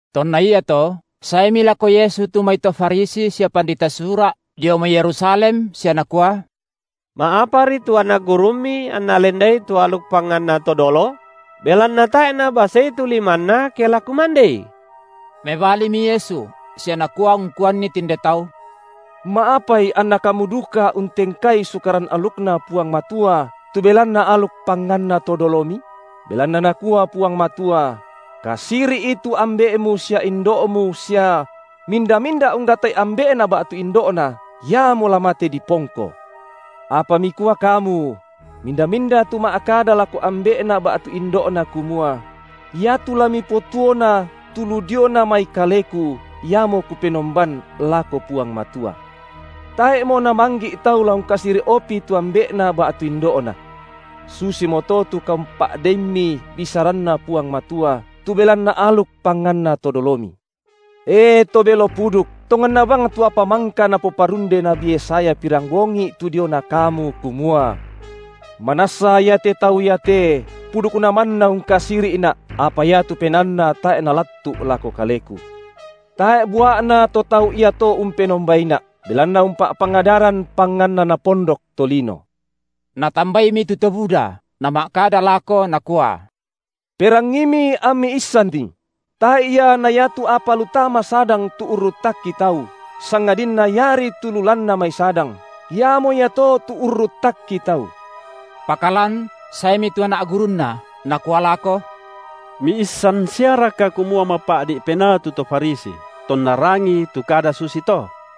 Tonna iato, saemi lako Yesu tu mai to Farisi sia pandita Sura’ dio mai Yerusalem sia nakua: Ma’apari tu anak gurumMi anna lendai tu aluk panganna to dolo? Belanna tae’ nabasei tu limanna, ke la kumandei. Mebalimi Yesu sia Nakua ungkuanni tinde tau: Ma’apai anna kamu duka untengkai Sukaran alukNa Puang Matua tu belanna aluk panganna to dolomi? Belanna Nakua Puang Matua: Kasiri’i tu ambe’mu sia indo’mu sia: Minda-minda unggatai ambe’na ba’tu indo’na, iamo la mate dipongko. Apa mikua kamu: Minda-minda tu ma’kada lako ambe’na ba’tu indo’na kumua: Iatu la mipotuona tu lu diona mai kaleku, iamo kupenomban (lako Puang Matua); tae’mo namanggi’ tau la ungkasiri’opi tu ambe’na ba’tu indo’na. Susimoto tu kaumpa’deimmi bisaranNa Puang Matua, tu belanna aluk panganna to dolomi. E to belo puduk, tonganna bang tu apa mangka napoparunde nabi Yesaya pirambongi’ tu diona kamu, kumua: Manassa iate tau iate pudukna manna ungkasiri’Na’, apa iatu penaanna tae’ nalattu’ lako Kaleku. Tae’ bua’na to tau iato umpenombaiNa’, belanna umpa’pangadaran panganna napondok tolino. Natambaimi tu to buda, Nama’kada lako Nakua: Perangiimi ammi issanni! Tae’ ia na iatu apa lu tama sadang tu urruttakki tau, sangadinna iari tu lu lanna mai sadang, iamo iato tu urruttakki tau. Pakalan saemi tu anak gurunNa, nakua lako: Miissan siaraka kumua mapa’di’ penaa tu to Farisi, tonna rangii tu kada susi to?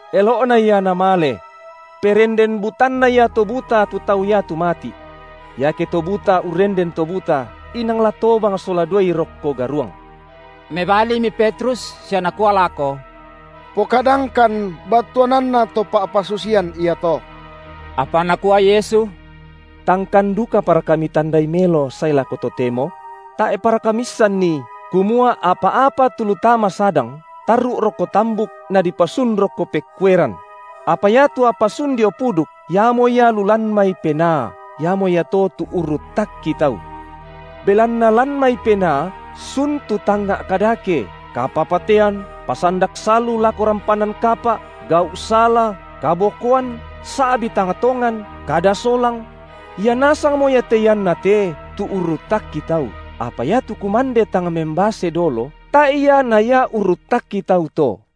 Elo’na ia namale. Perenden butanna ia to buta tu tau iatu mati’. Iake to buta urrenden to buta, inang la tobang sola duai rokko garuang. Mebalimi Petrus sia nakua lako: Pokadangkan battuananna to pa’pasusian iato. Apa Nakua Yesu: Tangkan dukaparaka mitandai melo sae lako totemo? Tae’paraka miissanni, kumua apa-apa tu lu tama sadang, tarru’ rokko tambuk nadipasun rokko pekkueran? Apa iatu apa sun dio puduk, iamo ia lu lan mai penaa; iamo ia to tu urruttakki tau. Belanna lan mai penaa sun tu tangnga’ kadake, kapapatean, pasandak salu lako rampanan kapa’, gau’ sala, kabokoan, sa’bi tang tongan, kada solang; ia nasangmo ia te ianna te tu urruttakki tau, apa iatu kumande tang membase dolo, tae’ ia na ia urruttakki tau to.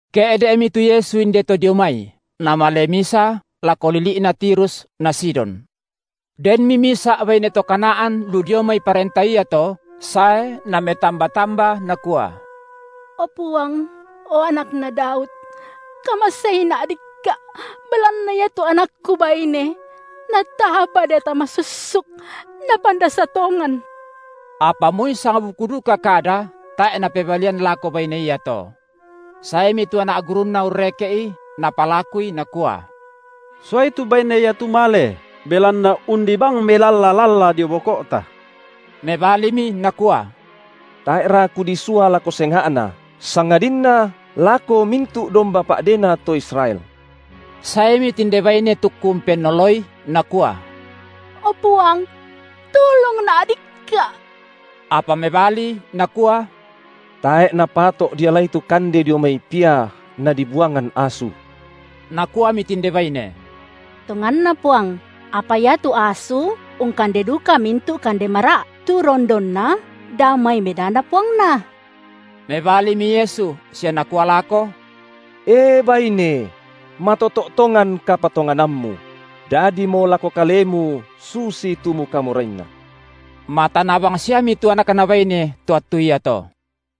Ke’de’mi tu Yesu indeto dio mai, Namale misa lako lili’na Tirus na Sidon. Denmi misa’ baine to Kanaan lu dio mai parenta iato sae nametamba-tamba nakua: O Puang, o Anakna Daud, kamaseina’ dikka’ belanna iatu anakku baine, nataba deata masussuk, napandasa tongan. Apa moi sangbuku duka kada tae’ Napebalian lako baine iato. Saemi tu anak gurunNa urreke’I napalakui nakua: suai tu baine iatu male, belanna undi bang melalla-lalla dio boko’ta. Mebalimi Nakua: Tae’ra Kudisua lako senga’na sangadinna lako mintu’ domba pa’dena to Israel. Saemi tinde baine tukku umpennoloI, nakua: O Puang, tulungna’ dikka’! Apa mebali, Nakua: Tae’ napato’ dialai tu kande dio mai pia, nadibuangan asu. Nakuami tinde baine: Tonganna Puang, apa iatu asu ungkande duka mintu’ kande mara’, tu rondonna dao mai medana puangna. Mebalimi Yesu, sia Nakua lako: E baine! matoto’ tongan kapatonganammu; dadimo lako kalemu susitu mukamorainna. Matana bangsiami tu anakna baine to attu iato.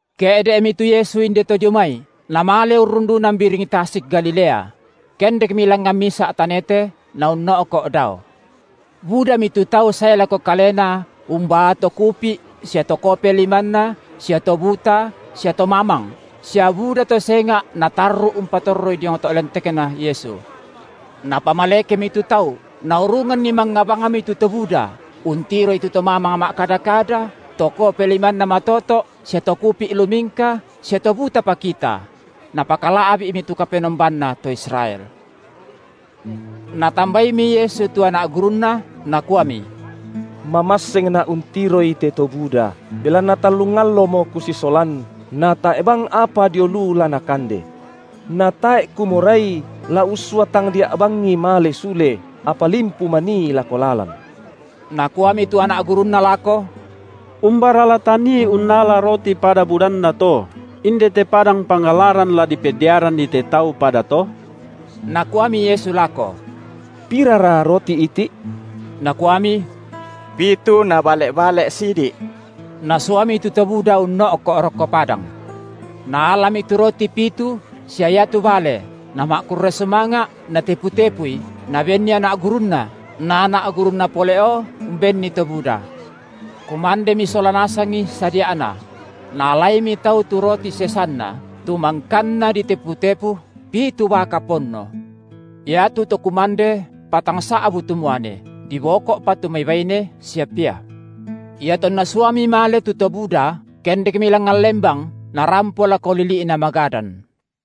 Ke’de’mi tu Yesu inde to dio mai, Namale urrundunan biring tasik Galilea; kendekmi langngan misa’ tanete, Naunno’ko’ dao. Budami tu tau sae lako Kalena umbaa to kupi’ sia to kope limanna sia to buta sia to mamang, sia buda to senga’ natarru’ umpatorroi diong to’ lentekNa Yesu. Napamalekemi tu tau, naurunganni mangnga bangmi tu to buda, untiroi tu to mamang ma’kada-kada, to kope limanna matoto’, sia to kupi’ lumingka, sia to buta pakita; napakala’bi’mi tu Kapenombanna to Israel. Natambaimi Yesu tu anak GurunNa, Nakuami: MamassengNa’ untiroi te to buda, belanna tallung allomo Kusisolan, na tae’ bang apa dio lu la nakande, na tae’ Kumorai la ussua tangdia’ bangi male sule, apa limpu manii lako lalan. Nakuami tu anak gurunNa lako: Umbara la tanii unnala roti pada budanna to, indete padang pangallaran la dipediaranni te tau pada to? Nakuami Yesu lako: Pirara roti iti’? Nakuami: Pitu na bale’-bale’ sidi’. Nasuami tu to buda unno’ko’ rokko padang. Naalami tu roti pitu sia iatu bale, Nama’kurre sumanga’ Natepu-tepui, Nabenni anak gurunNa, na anak gurunNa pole’ o umbenni to buda. Kumandemi sola nasangi sadia’na; naalaimi tau tu roti sesanna, tu mangkanna ditepu-tepu, pitu baka ponno. Iatu to kumande patangsa’bu tu muane, diboko’pa tu mai baine sia pia. Iatonna suami male tu to buda, kendekmi langngan lembang, Narampo lako lili’na Magadan.